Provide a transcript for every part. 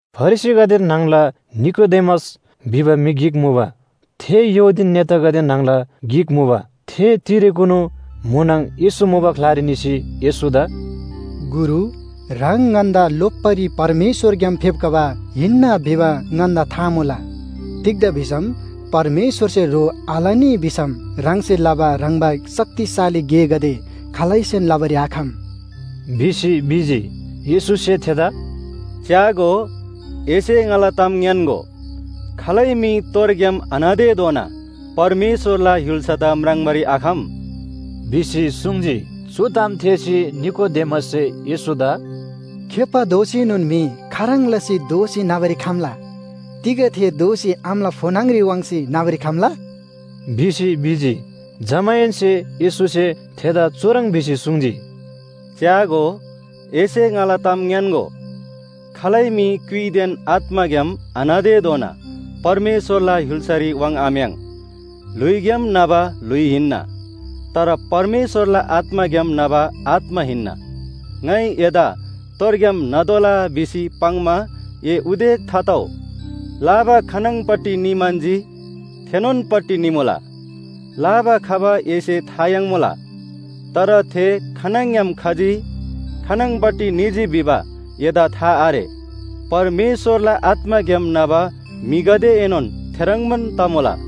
फरिसीगदे न्‍हङला निकोदेमस भिबा म्‍हि गिक मुबा। थे यहूदी नेतागदे न्‍हङला गिक मुबा। थे तिरेकुनु म्‍हुनङ येशू मुबा ग्‍लारी निसी येशूदा “गुरु, ह्राङ ङन्‍दा लोप्‍बारी परमेश्‍वरग्‍याम फेप्‍खबा हिन्‍ना भिबा ङन्‍दा था मुला। तिग्‍दा भिसम परमेश्‍वरसे ह्रो आलनी भिसम ह्राङसे लबा ह्रङ्‌बा शक्तिशाली गेगदे खालैसेन लबारी आखम” भिसी भिजी। येशूसे थेदा “च्‍यागो, एसे ङाला ताम ङ्‌यान्‍गो, खालै म्‍हि तोरग्‍याम आन्‍हतेधोना परमेश्‍वरला य्‍हुल्‍सादा म्राङ्बारी आखम” भिसी सुङ्जी। चु ताम थेःसी निकोदेमससे येशूदा “खेप्‍बा दोसीनोन म्‍हि खाह्रङ् लसी दोःसी न्‍हबारी खम्‍ला? तिग थे दोःसी आमाला फो न्‍हङ‍री वाङ्सी न्‍हबारी खम्‍ला?” भिसी भिजी। जमाहेन्‍से येशूसे थेदा चुह्रङ् भिसी सुङ्जी, “च्‍यागो, एसे ङाला ताम ङ्‌यान्‍गो, खालै म्‍हि क्‍युइदेन आत्‍माग्‍याम आन्‍हतेधोना परमेश्‍वरला य्‍हुल्‍सारी वाङ्‌आम्‍याङ्। ल्‍हुइग्‍याम न्‍हबा ल्‍हुइ हिन्‍ना, तर परमेश्‍वरला आत्‍माग्‍याम न्‍हबा आत्‍मा हिन्‍ना। ङाइ एदा तोरग्‍याम न्‍हतोःला भिसी पाङ्‌मा ए उदेक थातउ। लाबा खानङपट्टि निम्‍हन्‍जी थेनोनपट्टि निमुला। लाबा खबा एसे था याङ्मुला, तर थे खानङग्‍याम खजी खानङपट्टि निजी भिबा एदा था आरे। परमेश्‍वरला आत्‍माग्‍याम न्‍हबा म्‍हिगदेएनोन थेह्रङ्बान तमुला।”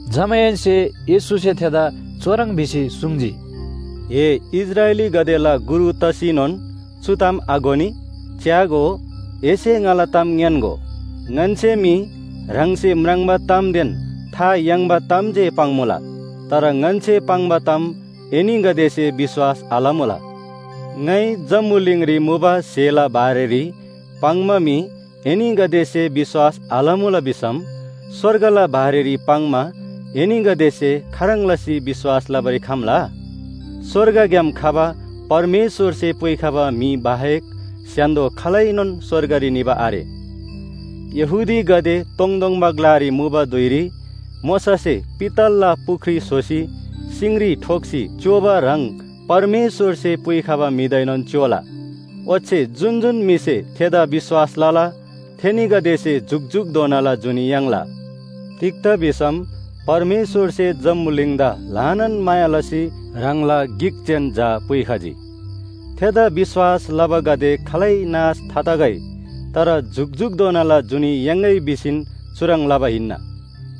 जमाहेन्‍से येशूसे थेदा चुह्रङ् भिसी सुङ्जी, “ए इस्राएलीगदेला गुरु तसीनोन चु ताम आघोनी? च्‍यागो, एसे ङाला ताम ङ्‌यान्‍गो, ङन्‍से मी ह्राङसे म्राङ्बा तामदेन था याङ्बा ताम जे पाङ्‌मुला। तर ङन्‍से पाङ्बा ताम एनीगदेसे विश्‍वास आलमुला। ङाइ जम्‍बुलिङरी मुबा स्‍हेला बारेरी पाङ्‌मा मी एनीगदेसे विश्‍वास आलमुला भिसम स्‍वर्गला बारेरी पाङ्‌मा एनीगदेसे खाह्रङ् लसी विश्‍वास लबारी खम्‍ला? “स्‍वर्गग्‍याम खबा परमेश्‍वरसे पुइखबा म्‍हि बाहेक स्‍य्‍हान्‍दो खालैनोन स्‍वर्गरी निबा आरे। यहूदीगदे तोङतोङबा ग्‍लारी मुबा धुइरी मोशासे पित्तलला पुख्री स्‍होसी सिङरी ठोक्‍सी च्‍योबा ह्रङ् परमेश्‍वरसे पुइखबा म्‍हिदाएनोन च्‍योला। ओच्‍छे जुन जुन म्‍हिसे थेदा विश्‍वास लला, थेनीगदेसे जुकजुकधोनाला जुनी याङ्ला। “तिग्‍दा भिसम परमेश्‍वरसे जम्‍बुलिङदा ल्‍हानान माया लसी ह्राङला गिक जेन झा पुइखजी। थेदा विश्‍वास लबागदे खालै नाश थातगै, तर जुकजुकधोनाला जुनी याङ्‌गै भिसीन चुह्रङ् लबा हिन्‍ना।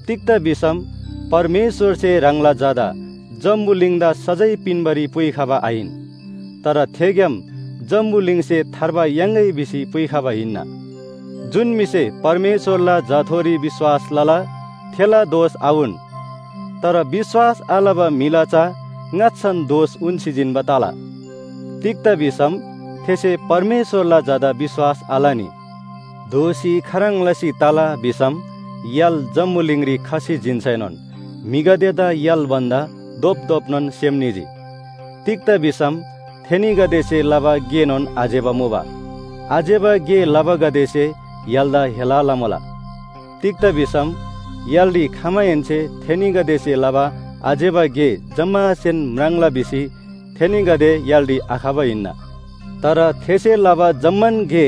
तिग्‍दा भिसम परमेश्‍वरसे ह्राङला झादा जम्‍बुलिङदा सजाय पिन्‍बारी पुइखबा आहिन। तर थेग्‍याम जम्‍बुलिङसे थार्बा याङ्‌गै भिसी पुइखबा हिन्‍ना। जुन म्‍हिसे परमेश्‍वरला झाथोरी विश्‍वास लला, थेला दोष आउन। तर विश्‍वास आलबा म्‍हिला चा ङाच्‍छान दोष उन्‍सी जिन्‍बा तला। तिग्‍दा भिसम थेसे परमेश्‍वरला झादा विश्‍वास आलनी। दोषी खाह्रङ् लसी तला भिसम य्‍हाल जम्‍बुलिङरी खसी जिन्‍सैनोन म्‍हिगदेदा य्‍हाल भन्‍दा धोपधोपनोन सेम निजी। तिग्‍दा भिसम थेनीगदेसे लबा गेनोन आज्‍यबा मुबा। आज्‍यबा गे लबागदेसे य्‍हालदा हेला लमुला। तिग्‍दा भिसम य्‍हालरी खमाहेन्‍से थेनीगदेसे लबा आज्‍यबा गे जम्‍मासेन म्राङ्ला भिसी थेनीगदे य्‍हालरी आखबा हिन्‍ना। तर थेसे लबा जम्‍मान गे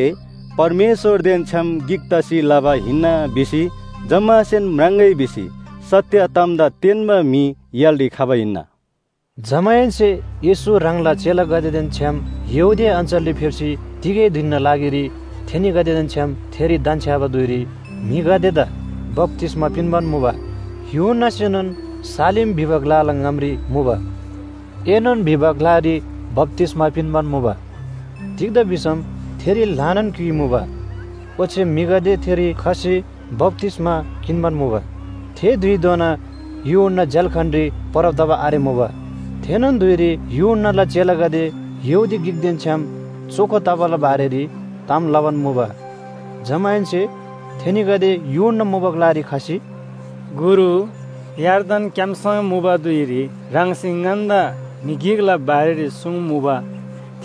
परमेश्‍वरदेन छ्‌याम गिक तसी लबा हिन्‍ना भिसी जम्‍मासेन म्राङ्‍गै भिसी सत्‍य तामदा तेन्‍बा म्‍हि य्‍हालरी खबा हिन्‍ना।” जमाहेन्‍से येशू ह्राङला चेलागदेदेन छ्‌याम यहूदिया अञ्‍चलरी फेप्‍सी तिगै धिनना लागिरी थेनीगदेदेन छ्‌याम थेरी धन्‍छ्‍याबा धुइरी म्‍हिगदेदा बप्‍तिस्‍मा पिन्‍बान मुबा। यूहन्‍नासेनोन सालीम भिबा ग्‍लाला ङामरी मुबा एनोन भिबा ग्‍लारी बप्‍तिस्‍मा पिन्‍बान मुबा। तिग्‍दा भिसम थेरी ल्‍हानान क्‍युइ मुबा, ओच्‍छे म्‍हिगदे थेरी खसी बप्‍तिस्‍मा किन्‍बान मुबा। थे धुइधोना यूहन्‍ना झ्‍याल्‍खानरी परब तबा आरेमुबा। थेनोन धुइरी यूहन्‍नाला चेलागदे यहूदी गिकदेन छ्‌याम चोखो तबाला बारेरी ताम लबान मुबा। जमाहेन्‍से थेनीगदे यूहन्‍ना मुबा ग्‍लारी खसी, “गुरु, यर्दन क्‍याम्‍सङ मुबा धुइरी ह्राङसे ङन्‍दा म्‍हि गिकला बारेरी सुङ्मुबा,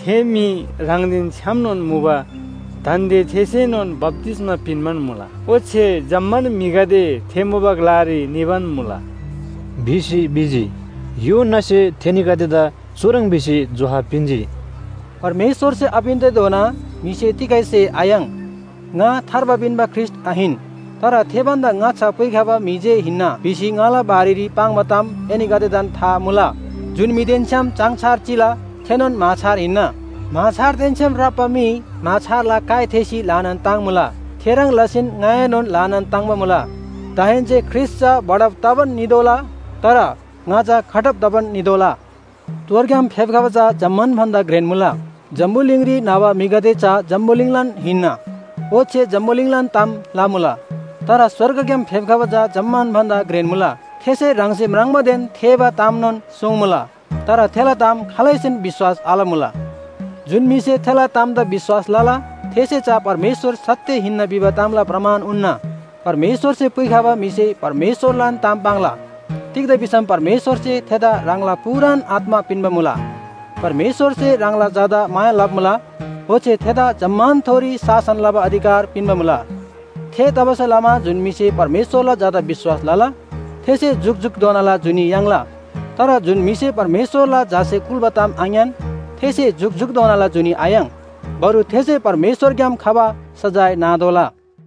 थे म्‍हि ह्राङदेन छ्‌यामनोन मुबा। दान्‍दे थेसेनोन बप्‍तिस्‍मा पिन्‍बान मुला, ओच्‍छे जम्‍मान म्‍हिगदे थे मुबा ग्‍लारी निबान मुला” भिसी भिजी। यूहन्‍नासे थेनीगदेदा चुह्रङ् भिसी जोहाब पिन्‍जी, “परमेश्‍वरसे आपिन्‍तेधोना म्‍हिसे तिगै स्‍हे आयाङ्। ‘ङा थार्बा पिन्‍बा ख्रीष्‍ट आहिन, तर थे भन्‍दा ङाच्‍छा पुइखबा म्‍हि जे हिन्‍ना’ भिसी ङाला बारेरी पाङ्बा ताम एनीगदेदान था मुला। जुन म्‍हिदेन छ्‌याम चाङछार चिला थेनोन म्‍हाछार हिन्‍ना। म्‍हाछारदेन छ्‌याम राप्‍बा म्‍हि म्‍हाछारला काइ थेःसी ल्‍हानान ताङ्मुला। थेह्रङ् लसीन ङाएनोन ल्‍हानान ताङ्‍बा मुला। दाहेन्‍से ख्रीष्‍ट चा बढब तबान नितोःला, तर ङा चा घटब तबान नितोःला। “तोरग्‍याम फेप्‍खबा चा जम्‍मान भन्‍दा घ्रेन मुला। जम्‍बुलिङरी न्‍हबा म्‍हिगदे चा जम्‍बुलिङलान हिन्‍ना, ओच्‍छे जम्‍बुलिङलान ताम लमुला। तर स्‍वर्गग्‍याम फेप्‍खबा चा जम्‍मान भन्‍दा घ्रेन मुला। थेसे ह्राङसे म्राङ्बादेन थेःबा तामनोन सुङ्मुला, तर थेला ताम खालैसेन विश्‍वास आलमुला। जुन म्‍हिसे थेला तामदा विश्‍वास लला, थेसे चा परमेश्‍वर सत्‍य हिन्‍ना भिबा तामला प्रमाण उन्‍ना। परमेश्‍वरसे पुइखबा म्‍हिसे परमेश्‍वरलान ताम पाङ्ला। तिग्‍दा भिसम परमेश्‍वरसे थेदा ह्राङला पूरान आत्‍मा पिन्‍बा मुला। परमेश्‍वरसे ह्राङला झादा माया लबा मुला, ओच्‍छे थेदा जम्‍मानथोरी शासन लबा अधिकार पिन्‍बा मुला। थेतबासेलमा जुन म्‍हिसे परमेश्‍वरला झादा विश्‍वास लला थेसे जुकजुकधोनाला जुनी याङ्ला। तर जुन म्‍हिसे परमेश्‍वरला झासे कुल्‍बा ताम आङ्‌यान थेसे जुकजुकधोनाला जुनी आयाङ्। बरु थेसे परमेश्‍वरग्‍याम खबा सजाय नातोःला।”